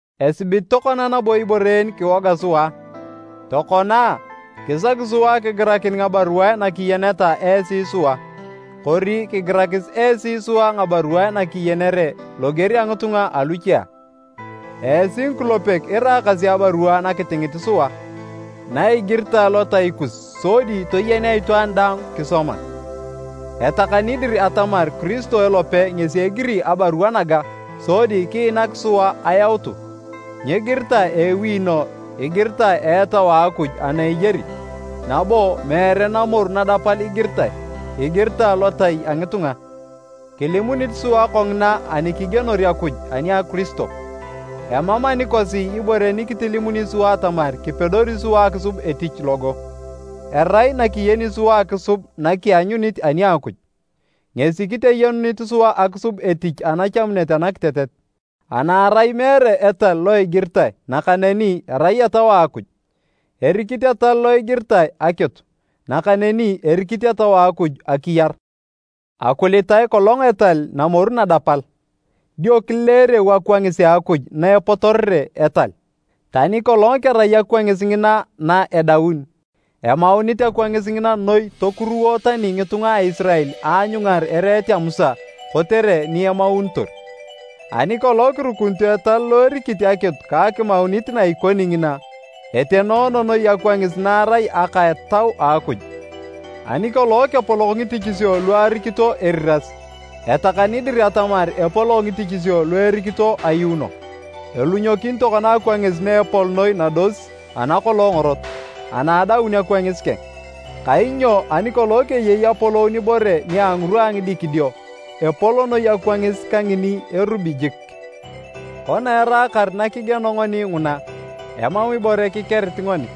Esibit tokona nabo ibore en kiwoga sua a? Tokona a, kisaki sua kigirakin ngabaruae nakiyeneta esi sua. Kori kigirakis esi sua ngabaruae nakiyenere, loger a ngitunga aluche a? Esi ngikulepek iraakasi abarua na kitingit sua, na igiritae lotai kus sodi toyenea itwaan daang kisoma. Etakani dir atamar Kiristo elope ngesi egiri abarua naga sodi kiinak sua ayautu. Nyigiritae a ewino igiritae a Etau a Akuj ana eyari, nabo meere namoru nadapal igiritae, igiritae lotai a ngitunga. Kilimunit sua kongina ani kigienor Akuj ani a Kiristo. Emam anikosi ibore nikitilimuni sua atamar kipedori sua akisub etich logo. Erai nakiyeni sua akisub nakianyunit ani a Akuj, ngesi kiteyenunit sua akisub etich anachamunet anakitetet, ana erai meere etal lo igiritae nakaneni erai Etau a Akuj. Erikit etal lo igiritae akitu, nakaneni erikit Etau a Akuj akiyar. Akulitae kolong etal namoru nadapal, dio kileereu akwangis a Akuj na epotorere etal. Tani kolong kerai akwangis ngina na edauni, emaunit akwangis ngina noi tokuruwo tani ngitunga a Isirael aanyungar ereet a Musa kotere ni emaunitor. Ani kolong kirukunito etal lo erikit akitu ka akimaunit na ikoni ngina, etenoono noi akwangis na erai aka a Etau a Akuj! Ani kolong kepolok ngitichisio lu arikito eriras, etakani dir atamar epolok ngitichisio lu erikito ayuuno! Elunyokin tokona akwangis na epol noi nados ana kolong ngorot, ana adaun akwangis keng. Kainyo ani kolong keyei apolou nibore nia ngirwa a ngidikidio, epol noi akwangis kangini erubi jik! Kona eraakar na kigieno ngoni nguna, emam ibore kikerit ngoni.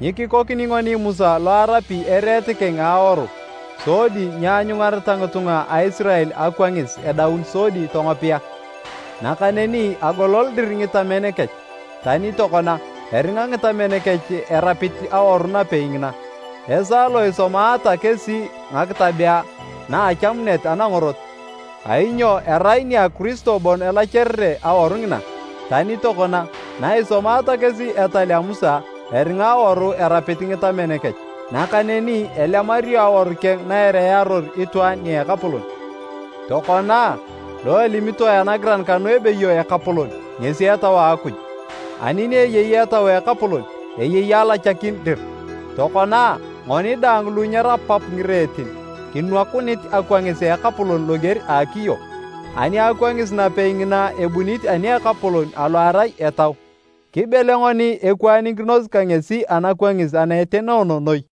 Nyikikoni ngoni Musa lo arapi ereet keng a aworu sodi nyeanyungareta ngitunga a Isirael akwangis edaun sodi tongopea. Nakaneni agolol dir ngitamen kech, tani tokona, eringa ngitamen kech erapit awaru napei ngina, esaa lo isomaata kesi ngakitabea na a achamunet anangorot. Kainyo erai nia Kiristo bon elacharere awaru ngina. Tani tokona, na isomaata kesi etal a Musa, eringa awaru erapit ngitamen kech. Nakaneni elemario awaru keng na ereyaror itwaan nia Ekapolon. Tokona a, lo elimitoe anagiran kanu ebeyo “Ekapolon” ngesi Etau a Akuj, ani ni eyei Etau a Ekapolon, eyei alachakin dir. Tokona a, ngoni daang lu nyerapap ngireetin, kinwakunit akwangis a Ekapolon loger a akiyo. Ani akwangis napei ngina ebunit ani a Ekapolon alo erai Etau, kibele ngoni ekwaanikinos ka ngesi anakwangis ana etenoono noi.